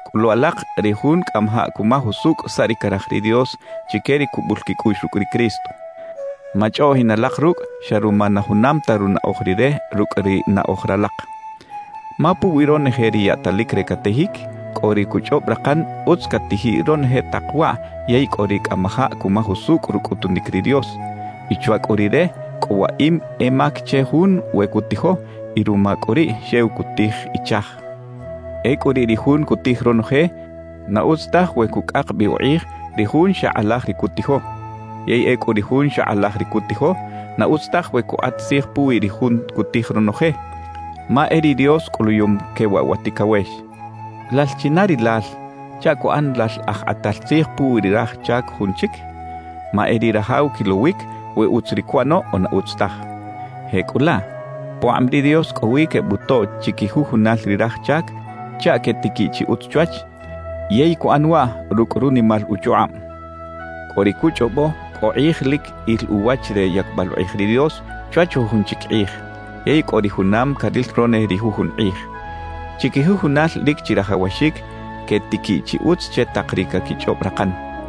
Cꞌulu alak ri jun cꞌamajaꞌ cumaj usucꞌ saꞌ ri caraj ri Dios chique ri cubul quicꞌuꞌx rucꞌ ri Cristo. Machꞌoꞌjin alak rucꞌ xa ruma na junam ta runaꞌoj rire rucꞌ ri naꞌoj ralak. Ma puwi ronoje ri yaꞌtalic re catijic, cꞌo ri cuchꞌob rakan utz catijiꞌ ronoje tak waꞌ yey cꞌo ri cꞌamajaꞌ cumaj usucꞌ rucꞌutunic ri Dios; y chwa cꞌu rire, cꞌo waꞌim e mac che jun we cutijo, y ruma cꞌu riꞌ xew cutij ichaj. Ecꞌu riꞌ ri jun cutij ronoje, na utz taj we cucꞌak bi ukꞌij ri jun xa kꞌalaj ri cutijo. Yey ecꞌu ri jun xa kꞌalaj ri cutijo, na utz taj we cukꞌat tzij puwi ri jun cutij ronoje. Ma e ri Dios cꞌuluyum que waꞌ wa ticawex. ¿Lal china rilal chaꞌ cuꞌan lal aj kꞌatal tzij puwi ri raj chac jun chic? Ma e ri rajaw quilowic we utz ri cuꞌano o na utz taj. Jecꞌulaꞌ pukꞌab ri Dios cꞌo wi quebutoꞌ chiquijujunal ri raj chac chaꞌ quetiquiꞌ chi utz chwach yey cuꞌan waꞌ rucꞌ runimal uchukꞌab. Cꞌo ri cuchꞌobo cꞌo kꞌij lic il uwach re yacbal ukꞌij ri Dios chwach jujun chic kꞌij; yey cꞌo ri junam caril ronoje ri jujun kꞌij. Chiquijujunal lic chirajawaxic quetiquiꞌ chi utz che tak ri caquichꞌob rakan.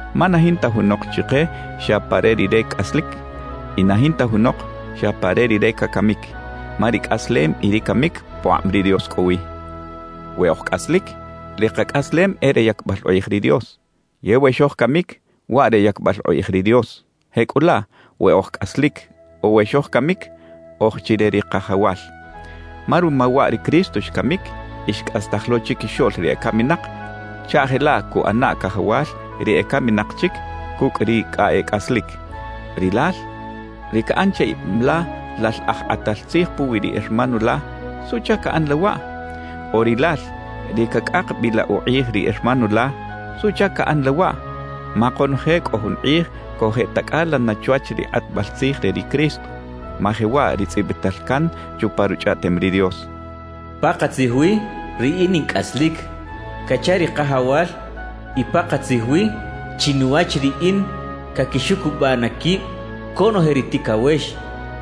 Ma na jinta junok chike xa pa re rire cꞌaslic y na jinta junok xa pa re rire cacamic. Ma ri cꞌaslem y ri camic pukꞌab ri Dios cꞌo wi. We oj cꞌaslic, ri kacꞌaslem e re yacbal ukꞌij ri Dios; yey we xojcamic, waꞌ re yacbal ukꞌij ri Dios. Jecꞌulaꞌ, we oj cꞌaslic o we xojcamic, oj chi re ri Kajawal. Ma ruma waꞌ ri Cristo xcamic y xcꞌastaj lo chiquixoꞌl ri ecaminak chaꞌ jelaꞌ cuꞌana Cajawal ri ecaminak chic cucꞌ ri cꞌa e cꞌaslic. Rilal, ri caꞌan che ib la lal aj kꞌatal tzij puwi ri hermano la, ¿suꞌchac caꞌan la waꞌ? O rilal, ri cacꞌak bi la ukꞌij ri hermano la, ¿suꞌchac caꞌan la waꞌ? Ma konoje cꞌo jun kꞌij cojeꞌtacꞌala na chwach ri kꞌatbal tzij re ri Cristo. Ma jewaꞌ ri tzꞌibital can chupa Ruchꞌaꞌtem ri Dios: Pakatzij wi Riꞌin in cꞌaslic, cacha ri Kajawal, y pakatzij wi, chinuwach Riꞌin caquixucubaꞌ na quib conoje ri ticawex,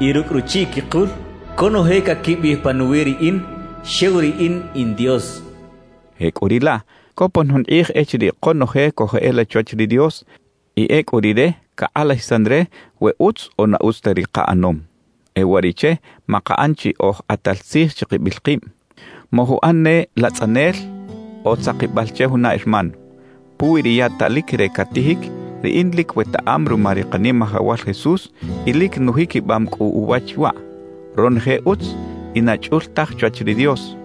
y rucꞌ ruchiꞌ quikul conoje caquibiꞌij panuwi Riꞌin, xew Riꞌin in Dios cachaꞌ. Jecꞌuriꞌlaꞌ copon jun kꞌij echiriꞌ konoje cojeꞌela chwach ri Dios y ecꞌu Rire cakꞌalajisan re we utz o na utz ta ri kaꞌanom. E uwariꞌche makaꞌan chi oj kꞌatal tzij chikibil kib; mojuꞌan ne latzꞌanel o tzakibal che juna hermano. Puwi ri yaꞌtalic re catijic, riꞌin lic wetaꞌam ruma ri Kanimajawal Jesús y lic nujiquibam cꞌu uwach waꞌ: Ronoje utz y na chꞌul taj chwach ri Dios.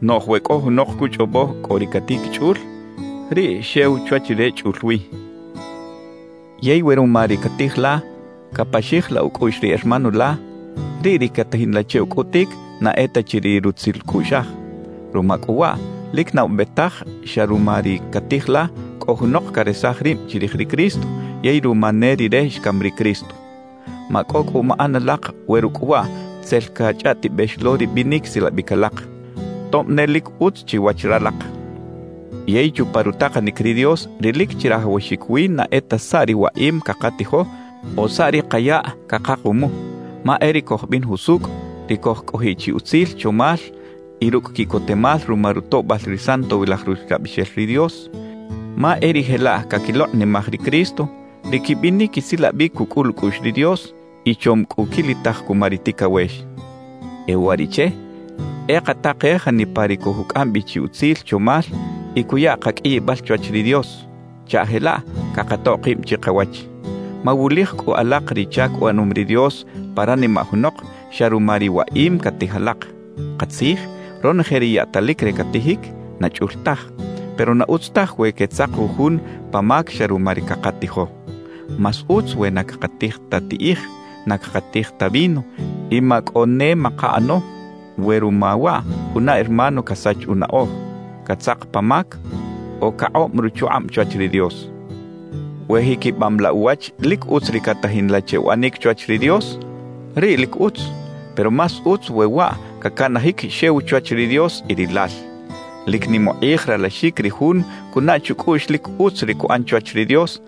Noꞌj we cꞌo junok cuchꞌobo cꞌo ri catijic “chꞌul”, riꞌ xew chwach rire chꞌul wi. Yey we ruma ri catij la, capaxij la ucꞌuꞌx ri hermano la, riꞌ ri catajin la che ucꞌutic na e ta chi ri rutzil cꞌuꞌxaj. Ruma cꞌu waꞌ, lic na ube taj xa ruma ri catij la, cꞌo junok caresaj rib chirij ri Cristo yey ruma ne rire xcam ri Cristo. Macꞌo cꞌu maꞌan alak we rucꞌ waꞌ tzel cachꞌaꞌtibex lo ri binic silabic alak, tob ne lic utz chiwach ralak. Yey chupa rutakanic ri Dios ri lic chirajawaxic wi na e ta saꞌ ri waꞌim cakatijo o saꞌ ri kayaꞌ cakakumu; ma e ri cojbin jusucꞌ, ri cojcꞌojiꞌ chi utzil chomal y rucꞌ quiꞌcotemal ruma rutoꞌbal ri Santowilaj Ruxlabixel ri Dios. Ma e ri jelaꞌ caquilokꞌnimaj ri Cristo, ri quibinic quisilabic cucꞌul ucꞌuꞌx ri Dios y chom cꞌu quilitaj cuma ri ticawex. E uwariꞌche, e katakej janipa ri cojucꞌam bi chi utzil chomal y cuya kaqꞌuiyibal chwach ri Dios, chaꞌ jelaꞌ cakatoꞌ kib chikawach. Mawulij cꞌu alak ri chac uꞌanom ri Dios pa ranimaꞌ junok xa ruma ri waꞌim catij alak. Katzij, ronoje ri yaꞌtalic re catijic, na chꞌul taj. Pero na utz taj we quetzak jujun pa mac xa ruma ri cakatijo. Más utz we na cakatij ta tiꞌij, na cakatij ta vino y macꞌo ne makaꞌano, we ruma waꞌ juna hermano casach unaꞌoj, catzak pa mac o cakꞌob ruchukꞌab chwach ri Dios. We jiquibam la uwach lic utz ri catajin la che uꞌanic chwach ri Dios, riꞌ lic utz; pero más utz we waꞌ cacanajic xew chwach ri Dios y rilal. Lic nim ukꞌij ralaxic ri jun cunaꞌ chucꞌuꞌx lic utz ri cuꞌan chwach ri Dios,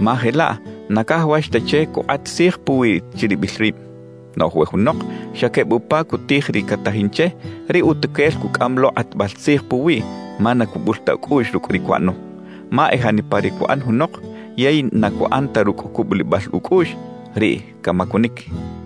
ma jelaꞌ na cajawax ta che cukꞌat tzij puwiꞌ chiribil rib. Noꞌj we junok xa queb upa cutij ri catajin che, riꞌ utuquel cucꞌam lo kꞌatbal tzij puwiꞌ ma na cubul ta ucꞌuꞌx rucꞌ ri cuꞌano. Ma e janipa ri cuꞌan junok yey na cuꞌan ta rucꞌ cubulibal ucꞌuꞌx, riꞌ camacunic.